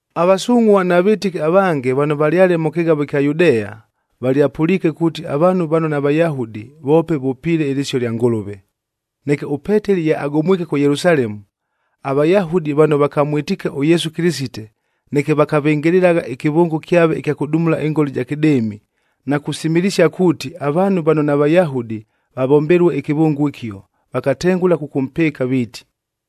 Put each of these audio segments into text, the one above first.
Avasungʼhua na vɨtɨki avange vano valyale mʉ kɨghavo ɨkya Yudea, valyapʉliike kuuti avaanhu vano naVayahudi voope vʉpiile ɨlɨsio lya Ngʉlʉve. Neke ʉPeteli ye agomwike kʉ Yelusalemu, aVayahudi vano vakamwɨtiike ʉYesu Kɨlɨsite neke vakavɨngɨlɨlagha ɨkɨvʉngo kyave ɨkya kʉdumula ɨngola ɨja kɨdɨɨmi,a na kusimilisia kuuti, avaanhu vano naVayahudi vavombelue ɨkɨvʉngo ɨkio, viiti,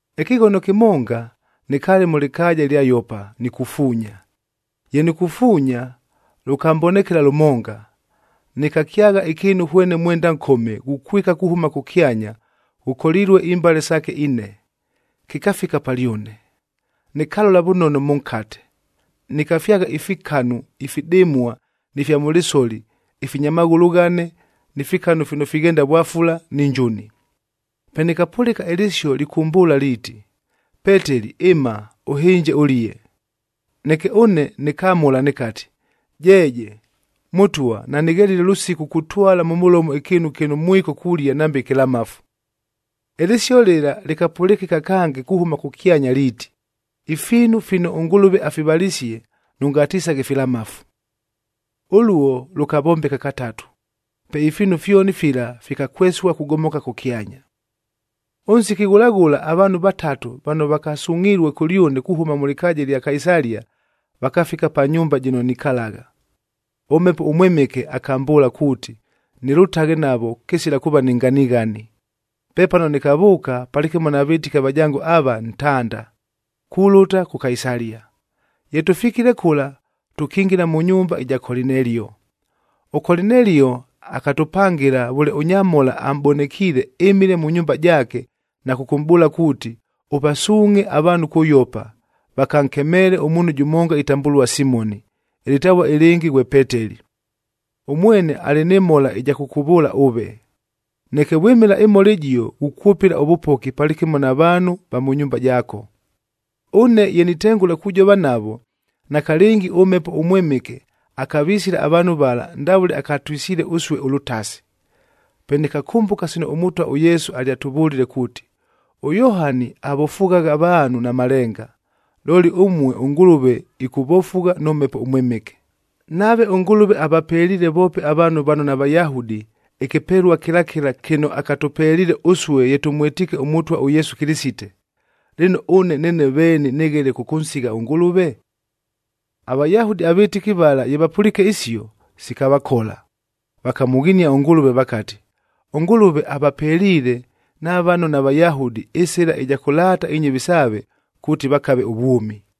“Ɨkɨghono kɨmonga, nɨkaale mʉ lɨkaaja ɨlya Yopa nikufuunya. Ye nikufuunya, lʉkambonekela lʉmonga, nɨkakyagha ɨkɨɨnu hwene mwenda nkome, ghukwika kuhʉma kʉkyanya ghʉkolilue imbale saake ine, kɨkafika palyʉne. Nɨkalola vʉnono mʉnkate, nɨkafyagha ifikanu ifidɨmua ni fya mʉ lɨsoli ifinya maghʉlʉ ghane, ni fikanu fino fighenda vwafula ni njuni. Pe nɨkapʉlɨka ɨlɨsio lɨkʉmbʉʉla liiti, ‘Peteli ɨma, ʉhɨnje ʉlie.’ Neke ʉne nɨkamʉla nɨkati, ‘Jeeje! Mʉtwa, nanɨghelile lʉsiku kutwala mʉ mʉlomo ɨkɨɨnu kɨno mwiko kulia nambe ɨkɨlamafu.’ Ɨlɨsio lɨla lɨkapʉlɨkɨka kange kuhʉma kʉkyanya liiti, ‘Ifiinu fino ʉNgʉlʉve afivalisie, nʉngatisaghe filamafu.’ Ʉluo lʉkavombeka katatu, pe ifiinu fyoni fila fikakwesua kugomoka kʉkyanya. “Ʉnsiki ghʉla ghʉla avaanhu vatatu vano vakasungʼhilue kʉlyʉne kuhʉma mʉ lɨkaaja ɨlya Kaisalia, vakafika pa nyumba jɨno nikalagha. ɄMhepo ʉMwɨmɨke akambʉʉla kuuti, nɨlʉtaghe navo kɨsila kuuva ni nganighani. Pepano nɨkavʉʉka palɨkɨmo na vɨtɨki avajango ava, ntanda, kulʉta kʉ Kaisalia. Ye tʉfikile kʉla, tʉkingila mʉ nyumba ɨja Kolinelio. ɄKolinelio akatʉpangɨla vʉle ʉnyamhola amʼbonekiile ɨmile mʉ nyumba jaake na kʉkʉmʼbʉʉla kuuti, ‘Ʉvasuungʼhe avaanhu kʉ Yopa, vakankemeele ʉmuunhu jʉmonga itambʉlua Simoni, ɨlɨtavua ɨlɨngɨ ghwe Peteli. Ʉmwene alɨ nɨ mhola ɨja kʉkʉvʉʉla ʉve. Neke vwɨmɨla ɨmhola ɨjio ghukwʉpɨla ʉvʉpoki palɨkɨmo na vaanhu va mʉ nyumba jaako.’ “Ʉne ye nitengʉla kujova navo, nakalɨngi ʉMhepo ʉMwɨmɨke akavisila avaanhu vala ndavʉle akatwisile ʉsue ʉlʉtasi. Pe nɨkakʉmbʉka sino ʉMʉtwa ʉYesu alyatʉvʉlile kuuti, ‘ɄYohani avofughagha avaanhu na malenga, looli ʉmue ʉNgʉlʉve ɨkʉvofugha nʉ Mhepo ʉMwɨmɨke.’ Nave ʉNgʉlʉve avapeliile voope avaanhu vano naVayahudi, ɨkɨpelua kɨla kɨla kɨno akatʉpeliile ʉsue ye tʉmwɨtiike ʉMʉtwa ʉYesu Kɨlɨsite, lɨno ʉne neene veeni nɨghele kʉkʉnsigha ʉNgʉlʉve?” AVayahudi avɨtɨki vala ye vapʉliike isio, sikavakola. Vakamʉghinia ʉNgʉlʉve vakati, “ɄNgʉlʉve avapeliile na vano naVayahudi ɨsɨla ɨja kʉlaata inyɨvi saave kuuti vakave ʉvwʉmi!”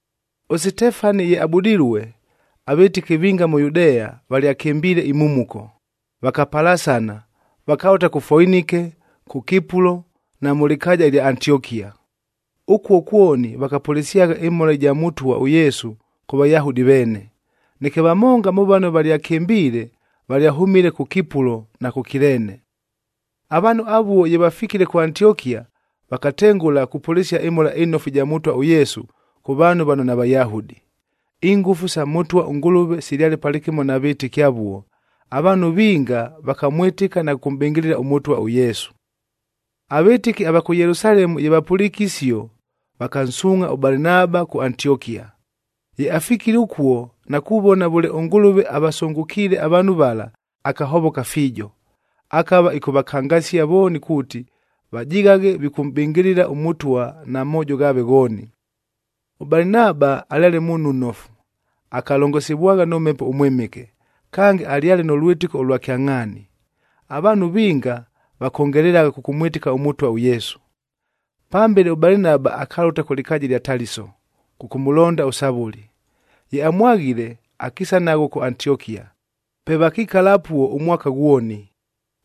ɄSitefani ye abudilue, avɨtɨki vinga mʉ Yudea valyakɨmbiile imhumuko, vakapalasana, vakalʉta kʉ Foinike, kʉ Kipulo na mʉ lɨkaaja ɨlya Antiokia. Ʉkuo kwoni vakapʉlɨsyagha ɨmhola ɨja Mʉtwa ʉYesu kʉ Vayahudi veene. Neke vamonga mʉ vano valyakɨmbiile valyahʉmile kʉ Kipulo na kʉ Kileene. Avaanhu avuo ye vafikile kʉ Antiokia, vakatengʉla kupʉlɨsia ɨMhola ɨNofu ɨja Mʉtwa ʉYesu kʉ vaanhu vano naVayahudi. Ingʉfu sa Mʉtwa ʉNgʉlʉve silyale palɨkɨmo na vɨtɨki avuo, avaanhu vinga vakamwɨtɨka na kʉkʉmʼbɨngɨlɨla ʉMʉtwa ʉYesu. Avɨtɨki ava kʉ Yelusalemu ye vapʉliike isio, vakansuungʼha ʉBalinaba kʉ Antiokia. Ye afikile ʉkuo na kuvona vʉle ʉNgʉlʉve avasʉngʉkiile avaanhu vala, akahovoka fiijo. Akava ɨkʉvakangasia vooni kuuti, vajighaghe vikʉmʼbɨngɨlɨla ʉMʉtwa na moojo ghaave ghooni. ɄBalinaba alyale muunhu nnofu, akalongosivwagha nʉ Mhepo ʉMwɨmɨke, kange alyale nʉ lwɨtɨko ʉlwa kyangʼhaani. Avaanhu vinga vakongelelagha kʉkʉmwɨtɨka ʉMʉtwa ʉYesu. Pambele ʉBalinaba akalʉta kʉ lɨkaaja ɨlya Taliso kʉkʉmʉlonda ʉSavʉli. Ye amwaghile, akiisa naghwo kʉ Antiokia. Pe vakikala apuo ʉmwaka ghwoni.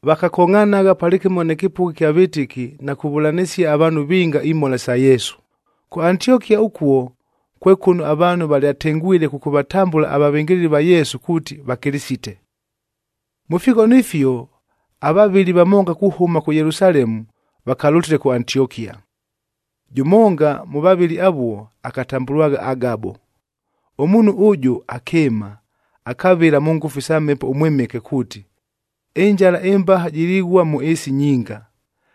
Vakakongʼhanagha palɨkɨmo nɨ kɨpʉgha kya vɨtɨki na kuvʉlanɨsia avaanhu vinga imhola isa Yesu. Kʉ Antiokia ʉkuo kwe kʉno avaanhu valyatengwile kʉkʉvatambʉla avavɨngɨlɨli va Yesu kuuti Vakɨlɨsite. Mʉ fighono ifio avavɨli vamonga kuhʉma kʉ Yelusalemu vakalʉtile kʉ Antiokia. Jʉmonga mʉ vavɨli avuo, akatambʉlwagha Agabo. Ʉmuunhu ʉjʉ akɨɨma, akavɨla mʉ ngʉfu isa Mhepo ʉMwɨmɨke kuuti, ɨnjala ɨmbaha jilighua mʉ ɨɨsi nyinga.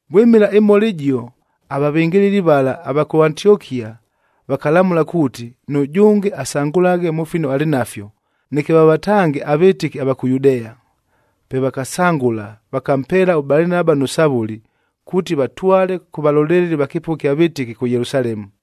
Vwɨmɨla ɨmhola ɨjio, avavɨngɨlɨli vala ava kʉ Antiokia vakalamʉla kuuti, nʉjʉnge asangʉlaghe mʉ fino alɨ nafyo, neke vavatange avɨtɨki ava kʉ Yudea. Pe vakasangʉla, vakampeela ʉBalinaba nʉ Savʉli, kuuti vatwale kʉ valoleleli va kɨpʉgha ɨkya vɨtɨki kʉ Yelusalemu.